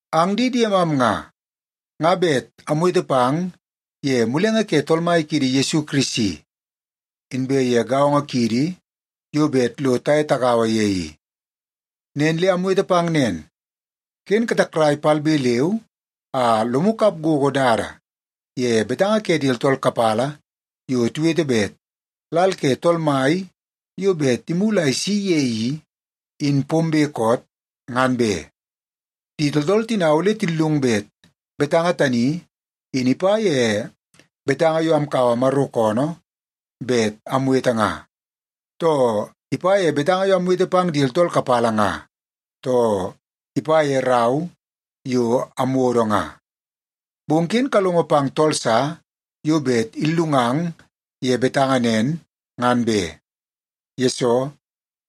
Ang di diemam nga, nga bet amwete pang ye mulenge ke Tool Mai kiidi Yesu Kirisi, inbe ye gaongo kiidi yo bet lo taye tagaua ye i. Nen le amwete pang nen, ken katakrai palbe leu a lomu kap gogo dada ye betanga ke di tooltool kapala yo tiwete bet lal ke Tool Mai yo bet imulu a isi ye i, in pombe koot, ngan be. Di tooltool tina ole tillung bet betanga tani in ipa ye betanga yo amkaua Maro koonoo bet amwete nga, too ipa ye betanga yo amwete pang di tooltool kapala nga, too ipa ye rau yo amwodo nga. Bong ken kalongo pang tool sa yo bet illungang ye betanga nen, ngan be. Yesoo,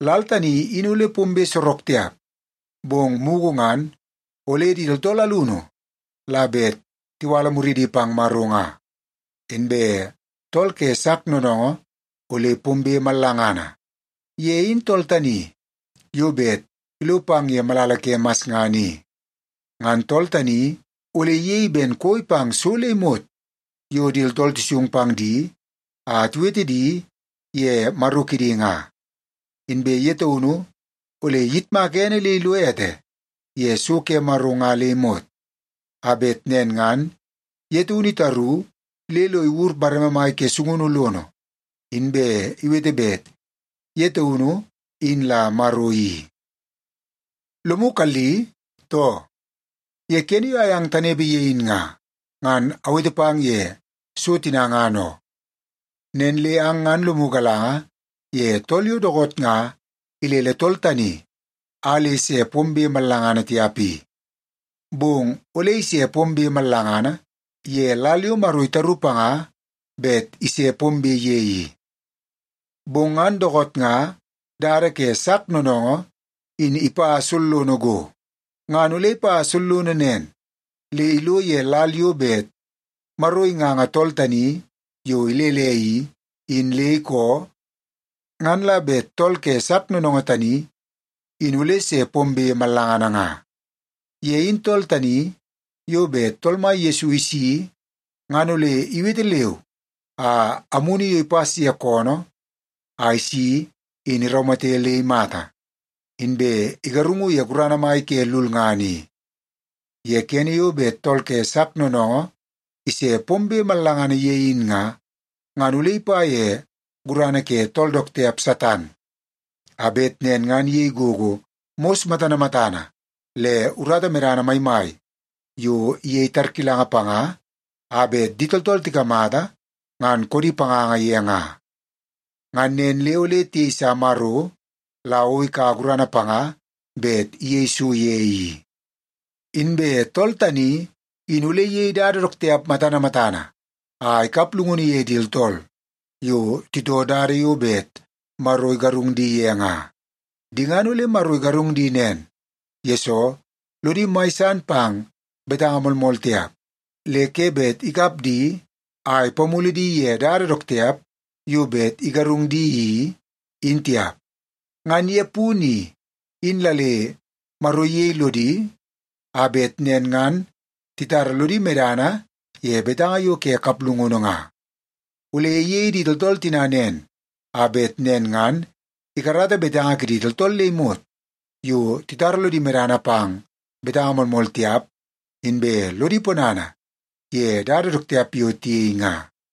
lal tani in ole pombe sorok tiap, bong mugu ngan ole di tooltool alunu la bet tiwala muridi pang Maro nga, inbe tool ke sak noonoongoo ole pombe mallangana. Ye in tool tani yo bet ilo pang ye malala ke masngana i. Ngan tool tani ole iyei ben koi pang so le imot yo di tooltool tisung pang di a tiwete di ye maro kidi nga. Inbe ye taunu ole iyitmaka ene le ilo ete ye so ke Maro nga le imot, a bet nen ngan ye taunu itaru le lo iwur bareme mai ke sungunu lono, inbe iwete bet ye taunu in la Maro i. Lomu kalli, too? Ye kene yo ayang tanepe ye in nga, ngan awete pang ye so tina ngan oo. Nen le ang ngan lomu galanga ye tool yo dookoot nga ilele tool tani a le se pombe mallangana tiap i. Bong ole ise pombe mallangana ye lal yo Maro itaru panga bet ise pombe ye i. Bong ngan dookoot nga dada ke sak noonoongoo in ipa sollono go. Ngan ole ipa sollono nen le ilo ye lal yo bet Maro inganga tool tani yo ilele i, in le ikoo, ngan la bet tool ke sak noonoongoo tani in ole se pombe mallangana nga. Ye in tool tani yo bet Tool Mai Yesu isi ngan ole iwete leu a amunu yo ipas ye koonoo a isi in iraumate le imata, inbe igarungu ye gurana mai ke lulngana i. Ye kene yo bet tool ke sak noonoongoo ise pombe mallangana ye in nga, ngan ole ipa ye gurana ke tool dook tiap Satan, a bet nen ngan iyei gogo mos matana matana le urata medana maimai yo iyei tarkilanga panga a bet di tooltool tikamata ngan koodi panganga ye nga. Ngan nen le ole tiyeisa Maro la o ikaua gurana panga bet iyei so ye i. Inbe tool tani in ole iyei dada dook tiap matana matana a ikap llungunu ye di tooltool yo titoo dada yo bet Maro igarung di ye nga. Di ngan ole Maro igarung di nen, yesoo lodi mai san pang betanga moolmool tiap, le ke bet ikap di a ipamulu di ye dada dook tiap yo bet igarung di i, in tiap. Ngan ye punu i, in la le Maro iyei lodi a bet nen ngan titara lodi medana ye betanga yo ke kaplungunu nga. Ole iyei di tooltool tina nen, a bet nen ngan ikarata betanga kidi tooltool le imot yo titara lodi medana pang betanga moolmool tiap, inbe lodi ponana ye dada dook tiap yo tiyei nga.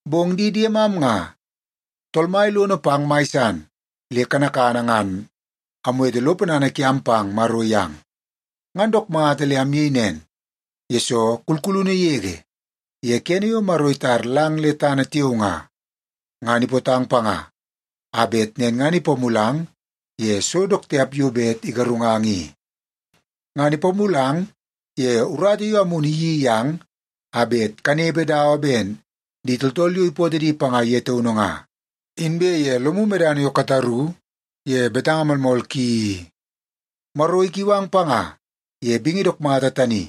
Bong di diemam nga, Tool Mai lono pang mai san le kanakana ngan amwete lo ponana kiam pang Maro yang. Ngan dook mata le amyei nen, yesoo kulkulunu yege ye kene yo Maro itar lang le tana tiao nga, ngan ipootang panga a bet nen ngan ipamulang ye so dook tiap yo bet igarungang i. Ngan ipamulang ye urata yo Amunu iyeii yang a bet kanepe dawa ben di tooltool yo ipootoo di panga ye taunu nga, inbe ye lomu medana yo kataru ye betanga moolmool ki i. Maro ikiu ang panga ye bingi dook mata tani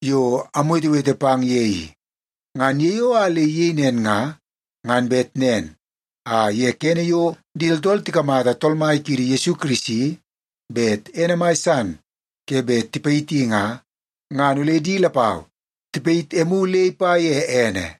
yo amwetewete pang ye i. Ngan ye yo a le iyei nen nga, ngan bet nen a ye kene yo di tooltool tikamata Tool Mai kiidi Yesu Kirisi bet ene mai san ke bet tipayiti nga, ngan ole di lapau tipayit emu le ipa ye ene.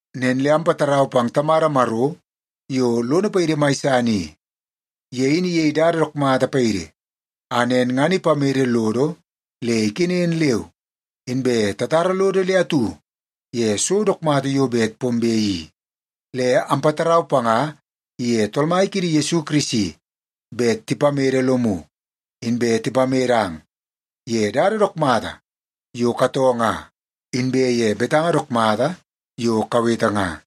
Nen le ampatarau pang Tamada Maro yo lono paidi mai san i. Ye in iyei dada dook mata paidi, a nen ngan ipamede lodo le ikenen leu inbe tatara lodo le atu ye so dook mata yo bet pombe i. Le ampatarau panga iye Tool Mai kiidi Yesu Kirisi bet tipamede lomu, inbe tipamedang ye dada dook mata yo katoo nga inbe ye betanga dook mata yo kawete nga.